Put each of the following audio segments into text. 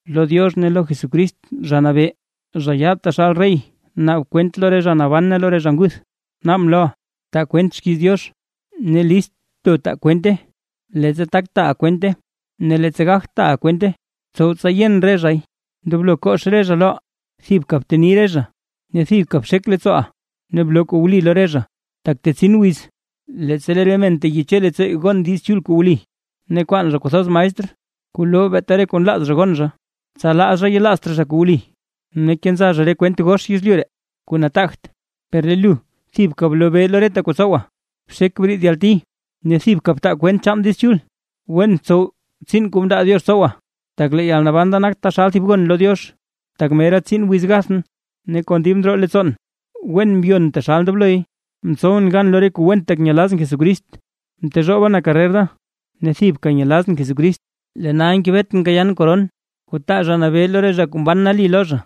Lo Diox ne lo Jesucrist Zha Nabee, zha yaad taxal rey naab kwent lo re zha naban ne lo re zha nguth, naabʼn loʼa; taa kwent xkiiz Diox, ne list bto taaʼa kwente, leettsa tak taaʼa kwente ne leettsa gagt taaʼa kwente. Btsow tsa yen re zhay, ndoblo kox re zha loʼa, thibka bteni re zha, ne thibka bxek leettsooʼa ne bloo kuu wli lo re zha. Tak tetsin wiz, leettsa lee re men teyeche leettsoo gon Diiz Chul kuu wli, ne kwaan zha kwathoz maestr, kuu loo beeta re kuu nlaaz zha gon zha, tsa laa zha yelaazt raa zha kuu wli, ne kenza zha re kwent gox yezlyu ree kuu nataagt. Per lee lu thibka blobee lo reta kuu tsowa, bxek briid yalti, ne thibka btaa kwent chaan Diiz Chul, wen tsow tsiin kuu mndaa Diox tsowa. Tak lee yalnaban da nak taxal thib gon lo Diox, tak mera tsin wiz gathʼn. Ne kon dib ndroo leettsoon wen mbyon taxal ndobloy, mtsowʼn gan lo re kuu went, tak nyelazʼn Jesucrist, mtezhooba na karrer da, ne thibka nyelazʼn Jesucrist. Lee nal ngebetʼn kayaan koron, kuu taa Zha Nabee lo re zha kuu mban nali lo zha,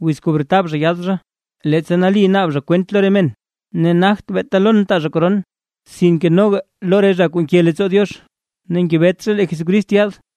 wiz kuu bretab zha yaad zha, leettsa nali naab zha kwent lo re men. Ne nagt beeta lon taa zha koron, sinke noga lo re zha kuu nke leettsoo Diox ne ngebet zha lee Jesucrist yaad.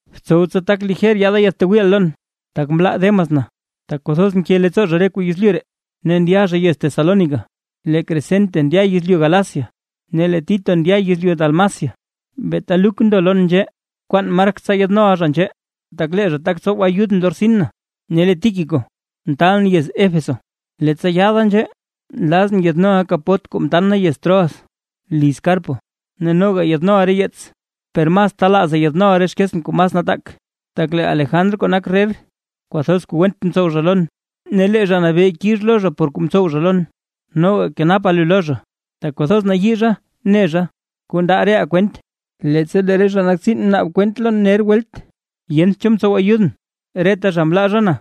Btsow tsa tak lijer yaada yaadtwiiʼa lon. Tak mlaa Demas na, tak kwathoz nke leettsoo zha re kuu yezlyu ree, ne ndya zha yez Tesalónica. Lee Crescente ndya yezlyu Galacia, ne lee Tito ndya yezlyu Dalmacia. Beeta Luk ndo lon nzhee. Bkwaan Mark tsa yaadnoʼa zha nzhee, tak lee zha tak tsow ayudʼn lo rtsin na. Ne lee Tíquico mtaalʼn nda yez Éfeso. Leettsa yaada nzhee nlazʼn yaadnoʼa kapot kuu mtan na yez Troas liz Carpo, ne noga yaadnoʼa re yeets, per mas telaaza yaadnoʼa re xkeetsʼn kuu mas nataak. Tak lee Alejandr kuu nak rrer, kwathoz kuu went mtsow zha lon; ne lee Zha Nabee kix lo zha por kuu mtsow zha lon. Noga kenapa lu lo zha, tak kwathoz nayii zha ne zha kuu nda reʼaa kwent. Leettsa lee re zha kuu nak tsiin mnaab kwent lon welt ner, yent cho mtsow ayudʼn, reta zha mlaa zha na.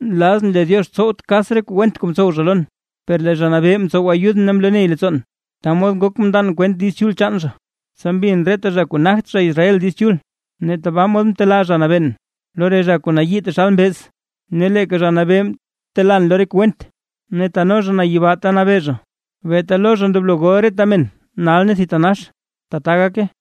Nlazʼn lee Diox tsowt kas re kuu went kuu mtsow zha lon. Per lee Zha Nabee mtsow ayudʼn ne mloo ney leettsoon, ta mod ngok mndan kwent Diiz Chul chaan zha, tsa mbin reta zha kuu nagt zha Israel Diiz Chul. Ne tabaa mod mtelaa Zha Nabeen lo re zha kuu nayii taxal mbeez. Ne leeka Zha Nabee telaan lo re kuu went, ne teno zha na yibaa ta nabee zha. ¡Beeta lo zha ndoblo gol reta men nal ne thitanax! ¡Tata gake!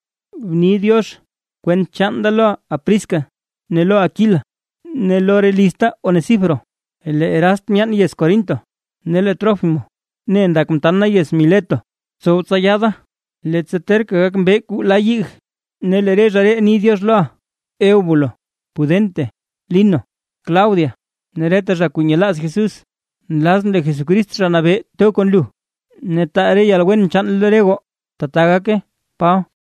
Bni “diox” kwent chaan da lo Prisca ne lo Aquila, ne lo re lizta Onesíforo. Lee Erast myaan yez Corinto, ne lee Trófimo ne ndak mtan na yez Mileto. Btsow tsa yaada, leettsa terka gak mbee kuu la yig. Ne lee re zha ree ni “diox” loʼa, Eubulo, Pudente, Lino, Claudia ne reta zha kuu nyelaaz Jesús. Nlazʼn lee Jesucrist Zha Nabee to kon lu, ne taa re yalwen chaan lo re goo. ¡Tbaa gake! Paba